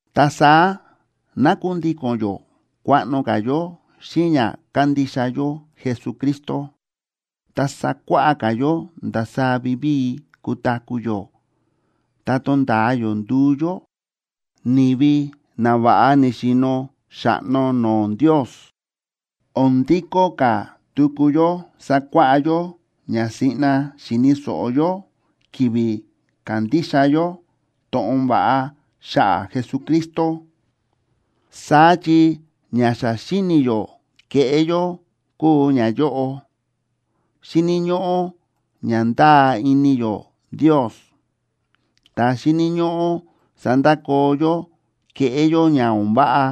Ta saá ná kundíko̱n yó kuaꞌno ka̱ yó xíꞌin ña kándixa yó Jesucristo, ta sakuáꞌá ka̱ yó ndasaá vivíi kutaku̱ yó ta tonda̱a yó nduu yó ni̱vi na va̱ꞌa ni̱xi̱no̱ xa̱ꞌno no̱o̱ Ndios. O̱n ndikó ka̱ tuku yó sakuáꞌá yó ña siꞌna xi̱ni̱ so̱ꞌo yó ki̱vi̱ ka̱ndixa yó to̱ꞌon va̱ꞌa xa̱ꞌa̱ Jesucristo. Saá chi ña xa xíni̱ yó keꞌé yó kúu ñayóꞌo, xíni̱ ñóꞌó ña ndáa ini yó Ndios, ta xíni̱ ñóꞌó sandakoo yó kéꞌé yó ña o̱n váꞌa,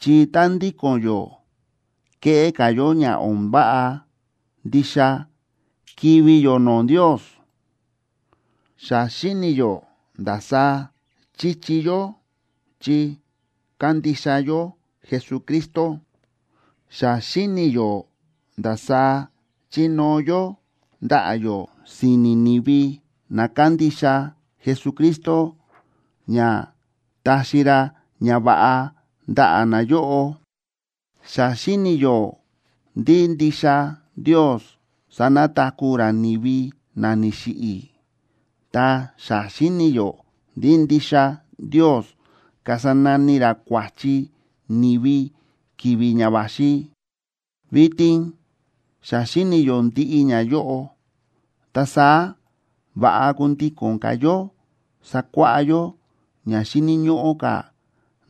chi tá ndíko̱n yó kéꞌé ka̱ yó ña o̱n váꞌa, ndixa kivi̱ yó no̱o̱ Ndios. Xa xíni̱ yó ndasaá chíchi yó chi kándixa yó Jesucristo, xa xíni̱ yó ndasaá chínóo yó ndaꞌa̱ yó si̱ni̱ ni̱vi na kándixa Jesucristo ña taxi ra ñava̱ꞌa ndaꞌa̱ nayóꞌo, xa xíni̱ yó ndí ndixa Ndios sanataku̱ ra ni̱vi na ni̱xiꞌi̱, ta xa xíni̱ yó ndí ndixa Ndios kasa nani ra kua̱chi ni̱vi ki̱vi̱ ña va̱xi. Vitin xa xíni̱ yó ndiꞌi ñayóꞌo, ta saá va̱ꞌa kundíko̱n ka̱ yó sakuáꞌá yó ña xíni̱ ñóꞌó ka̱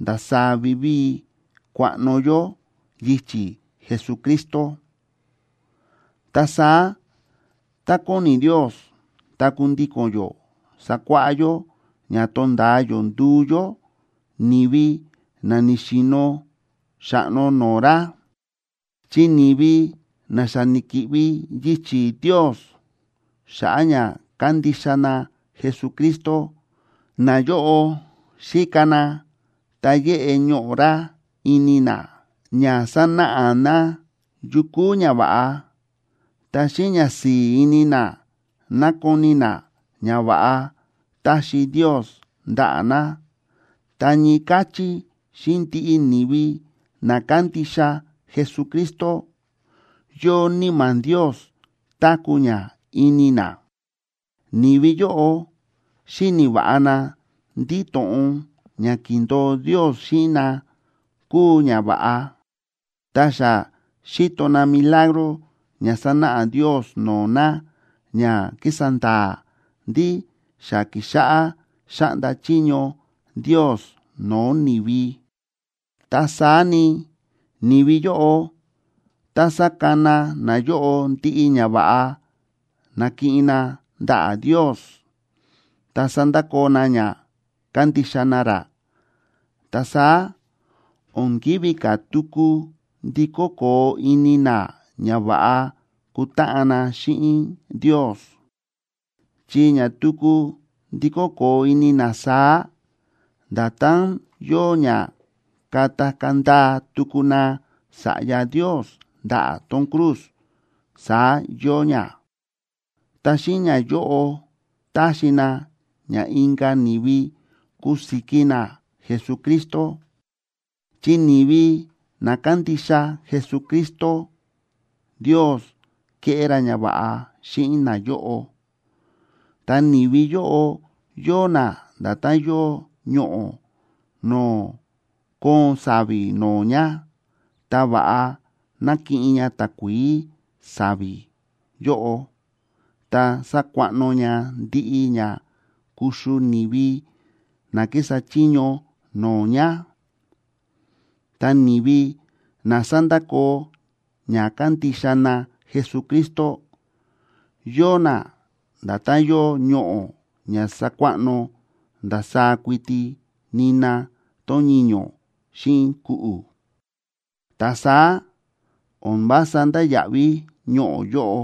ndasaá vivíi kuaꞌno yó yichi̱ Jesucristo. Ta saá tá kóni Ndios, ta kundíko̱n yó sakuáꞌá yó ña tonda̱a yó nduu yó ni̱vi na ni̱xi̱no̱ xa̱ꞌno no̱o̱ ra. Chi ni̱vi na xa ni̱ki̱ꞌvi yichi̱ Ndios, xa̱ꞌa̱ ña kándixa na Jesucristo, nayóꞌo xíka na ta yéꞌe ñoꞌo̱ ra ini na ña sanáꞌa na yu kúu ña va̱ꞌa, ta xíꞌin ñasi̱i̱ ini na nákoni na ñava̱ꞌa táxi Ndios ndaꞌa̱ na, ta ñii káchí xíꞌin ndiꞌi ni̱vi na kándixa Jesucristo, yóo Níma̱ Ndios táku̱ ña ini na. Ni̱vi yóꞌo xíni̱ va̱ꞌa na ndí to̱ꞌon ña ki̱ndo̱o Ndios xíꞌin na kúu ña va̱ꞌa. Ta xa xíto na milagro ña sánáꞌa Ndios no̱o̱ na ña kísa nda̱a̱ ndí xa kíxáꞌá xáꞌnda chiño Ndios no̱o̱ ni̱vi. Ta saá ni, ni̱vi yóꞌo, tá sakana nayóꞌo ndiꞌi ñava̱ꞌa na̱kiꞌin na ndaꞌa̱ Ndios ta sandakoo na ña kándixa na ra, ta saá o̱n kívi ka̱ tuku ndikó koo ini na ña va̱ꞌa kutáꞌan na xíꞌin Ndios. Chi ña tuku ndikó koo ini na saá, nda̱tán yóo ña katakaa̱ ndaa tuku na Sa̱ꞌya Ndios ndaꞌa̱ tón cruz, saá yóo ña, ta xíꞌin ñayóꞌo taxi na ña inka̱ ni̱vi kusiki na Jesucristo. Chi ni̱vi na kándixa Jesucristo, Ndios kéꞌé ra ñava̱ꞌa xíꞌin nayóꞌo, ta ni̱vi yóꞌo yóo na nda̱tán yóo ñoꞌo̱ no̱o̱ kóon sa̱vi̱ no̱o̱ ña, ta va̱ꞌa nákiꞌin ña takuií sa̱vi̱ yóꞌo ta sákuaꞌno ña ndiꞌi ña kuxu ni̱vi na kísa chiño no̱o̱ ña. Ta ni̱vi na sándakoo ña kándixa na Jesucristo, yóo na nda̱tán yóo ñoꞌo̱ ña sákuaꞌno ndasaá kuiti nina tón ñiño̱ xíꞌin ku̱ꞌu̱, ta saá o̱n vása ndáya̱ꞌví ñoꞌo̱ yóꞌo,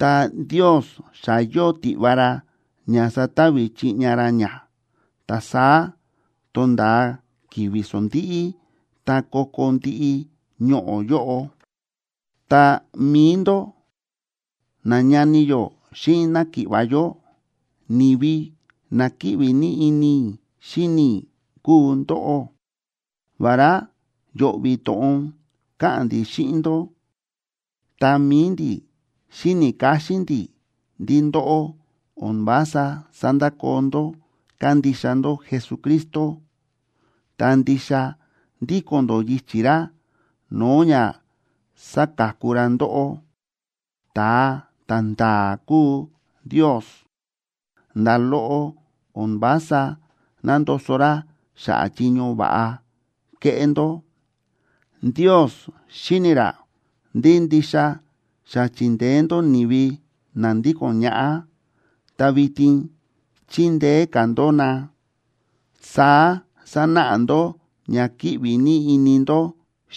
ta Ndios xa yóo tiꞌva ra ña satavi chiꞌña ra ña, ta saá tonda̱a ki̱vi̱ sondíꞌí ta ko̱ko̱ ndiꞌi ñoꞌo̱ yóꞌo. Ta mi̱i ndó, nañani yó xíꞌin náki̱ꞌva̱ yó, ni̱vi na kíꞌvi ní ini i̱ xíni i̱ kúu ndóꞌó. Vará yo̱ꞌvi̱ to̱ꞌon káꞌa̱n ndi̱ xíꞌin ndó, ta mi̱i ndi̱ xíni̱ káxín ndi̱ ndí ndóꞌó o̱n vása sándakoo ndó kándixa ndó Jesucristo, ta ndixa ndíko̱n ndó yichi̱ ra no̱o̱ ña sáka̱ku ra ndóꞌó. Ta̱a ta̱nda̱a̱ kúu Ndios. Nda̱ loꞌo o̱n vása nándoso ra xa̱ꞌa̱ chiño va̱ꞌa kéꞌé ndó. Ndios xíni̱ ra ndí ndixa xa chi̱ndeé ndó ni̱vi na ndíko̱n ñaꞌá, ta vitin chíndeé ka̱ ndó na. Saá sánáꞌa ndó ña kíꞌvi ní ini ndó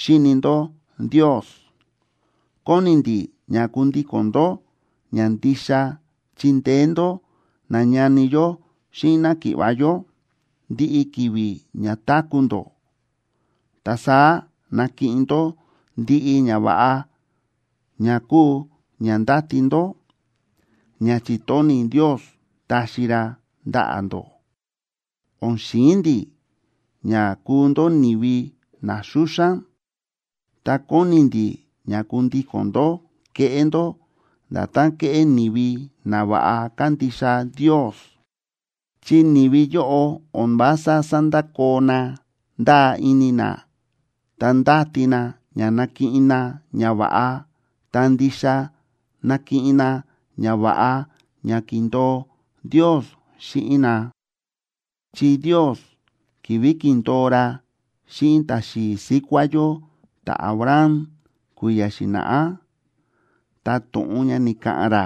xíni ndó Ndios. Kóni ndi̱ ña kundíko̱n ndó ña ndixa chindeé ndó nañani yó xíꞌin náki̱ꞌva̱ yó ndiꞌi ki̱vi̱ ña táku̱ ndó, ta saá nakiꞌin ndó ndiꞌi ñava̱ꞌa ña kúu ña ndáti ndó, ña chi̱tóni̱ Ndios taxi ra ndaꞌa̱ ndó. O̱n xi̱in ndi̱ ña kuu ndó ni̱vi na xúxán, ta kóni ndi̱ ña kundíko̱n ndó keꞌé ndó nda̱tán kéꞌé ni̱vi na va̱ꞌa kándixa Ndios. Chi ni̱vi yóꞌo o̱n vása sándakoo na ndáa ini na ta ndáti na ña nakiꞌin na ñava̱ꞌa, ta ndixa nakiꞌin na ñava̱ꞌa ña ki̱ndo̱o Ndios xíꞌin na. Chi Ndios, ki̱vi̱ ki̱ndo̱o ra xíꞌin ta̱xi̱i̱ síkuá yó ta̱Abraham kui̱ya̱ xi̱na̱ꞌá, ta to̱ꞌon ña ni̱ka̱ꞌa̱n ra,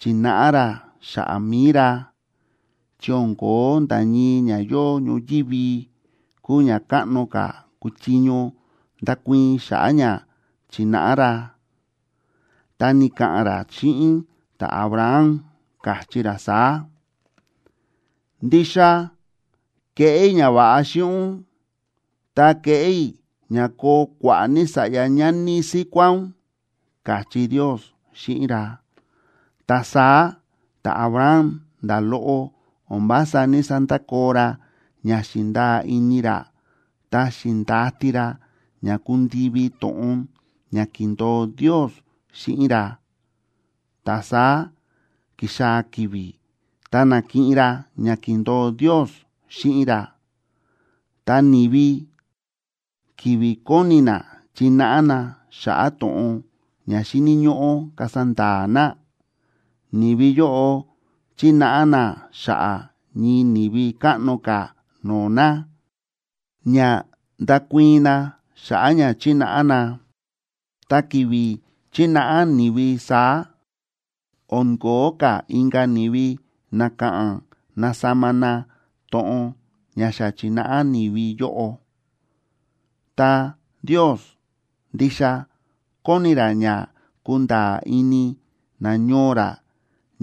chi̱náꞌa ra xa̱ꞌa̱ mi̱i ra, chi o̱n ko̱ó nda̱ ñii ña yóo ñoyívi kúu ña káꞌno ka̱ kuchiño ndakuii̱n xa̱ꞌa̱ ña chináꞌa ra. Ta ni̱ka̱ꞌa̱n ra xíꞌin ta̱Abraham, káchí ra saá: “Ndixa keꞌé i̱ ñava̱ꞌa xíꞌin ún, ta keꞌé i̱ ña koo kua̱ꞌa̱ ní sa̱ꞌya ñani síkuá ún”, káchí Ndios xíꞌin ra. Ta saá ta̱Abraham, nda̱ loꞌo o̱n vása ní‑sandakoo ra ña xi̱ndaa ini ra ta xi̱ndati ra ña kundivi to̱ꞌon ña ki̱ndo̱o Ndios xíꞌin ra, ta saá ki̱xaa̱ ki̱vi̱ ta na̱kiꞌin ra ña ki̱ndo̱o Ndios xíꞌin ra. Ta ni̱vi, ki̱vi̱ kóni na chináꞌa na xa̱ꞌa̱ to̱ꞌon ña xíni̱ ñóꞌó kasa nda̱a̱ na, ni̱vi yóꞌo chínáꞌa na xa̱ꞌa̱ ñii ni̱vi káꞌno ka̱ no̱o̱ na, ña ndakuii̱n na xa̱ꞌa̱ ña chi̱náꞌa na. Ta ki̱vi̱ chínáꞌa ni̱vi saá, o̱n ko̱ó ka̱ inka̱ ni̱vi na ka̱ꞌa̱n nasama na to̱ꞌon ña xa chi̱náꞌa ni̱vi yóꞌo. Ta Ndios ndixa kóni ra ña kunda̱a̱ ini nañoo ra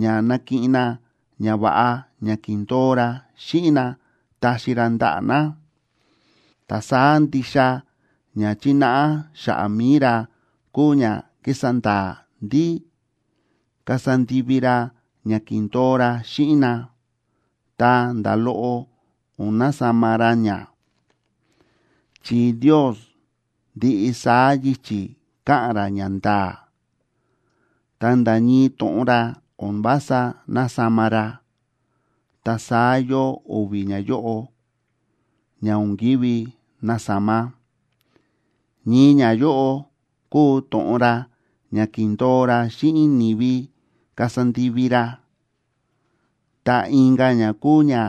ña nakiꞌin na ñava̱ꞌa ña ki̱ndo̱o ra xíꞌin na taxi ra ndaꞌa̱ na, ta saá ndixa ña chínáꞌa xa̱ꞌa̱ mi̱i ra kúu ña ki̱sa nda̱a̱ ndí kasa ndivi ra ña ki̱ndo̱o ra xíꞌin na, ta nda̱ loꞌo o̱n nasama ra ña. Chi Ndios ndiꞌi saá yichi̱ káꞌa̱n ra ñanda̱a̱, ta nda̱ ñii to̱ꞌon ra o̱n vása násama ra, ta saá yóo o̱vi̱ ñayóꞌo ña o̱n ki̱ví nasama. Ñii ñayóꞌo kúu to̱ꞌon ra ña ki̱ndo̱o ra xíꞌin ni̱vi kasa ndivi ra, ta inka̱ ña kúu ña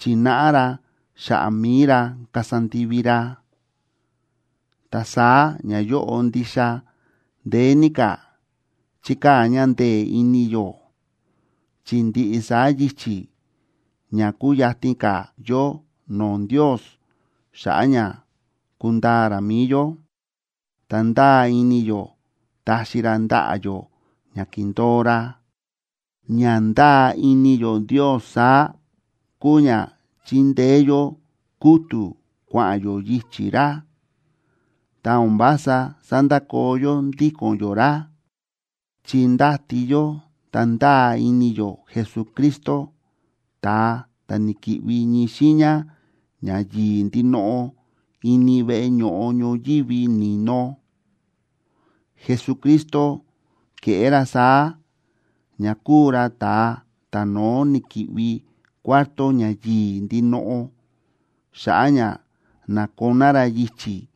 chi̱náꞌa ra xa̱ꞌa̱ mi̱i ra kasa ndivi ra. Ta saá ñayóꞌo ndixa ndeé ní ka̱ chíkaa̱ ña ndee̱ ini yó, chi ndiꞌi saá yichi̱ ña kúyatin ka̱ yó no̱o̱ Ndios xa̱ꞌa̱ ña kundaa ra mi̱i yó, ta ndáa ini yó taxi ra ndaꞌa̱ yó ña ki̱ndo̱o ra. Ña ndáa ini yó Ndios saá, kúu ña chíndeé yó kútu̱ kua̱ꞌa̱n yó yichi̱ ra, ta o̱n vása sandakoo yó ndíko̱n yó ra.a Chi ndáti yó ta ndáa ini yó Jesucristo, ta̱a ta̱ ni̱ki̱ꞌvi ñii xiiña ña yi̱i̱ ndinoꞌo ini veꞌe ño̱ꞌo ñoyívi ni̱no. Jesucristo ke̱ꞌé ra saá ña kúu ra ta̱a ta̱no̱ó ni̱ki̱ꞌvi Cuarto Ña Yi̱i̱ Ndinoꞌo xa̱ꞌa̱ ña na̱koná ra yichi̱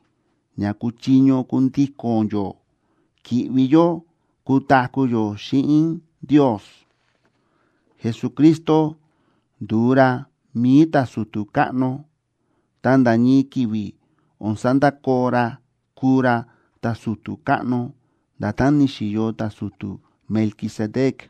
ña kuchiño kundíko̱n yó ki̱ꞌvi yó kutaku̱ yó xíꞌin Ndios. Jesucristo ndu̱u ra mi̱i ta̱su̱tu̱ káꞌno, ta nda̱ ñii ki̱vi̱ o̱n sandakoo ra kuu ra ta̱su̱tu̱ káꞌno, nda̱tán ni̱xi̱yo ta̱su̱tu̱ Melquisedec.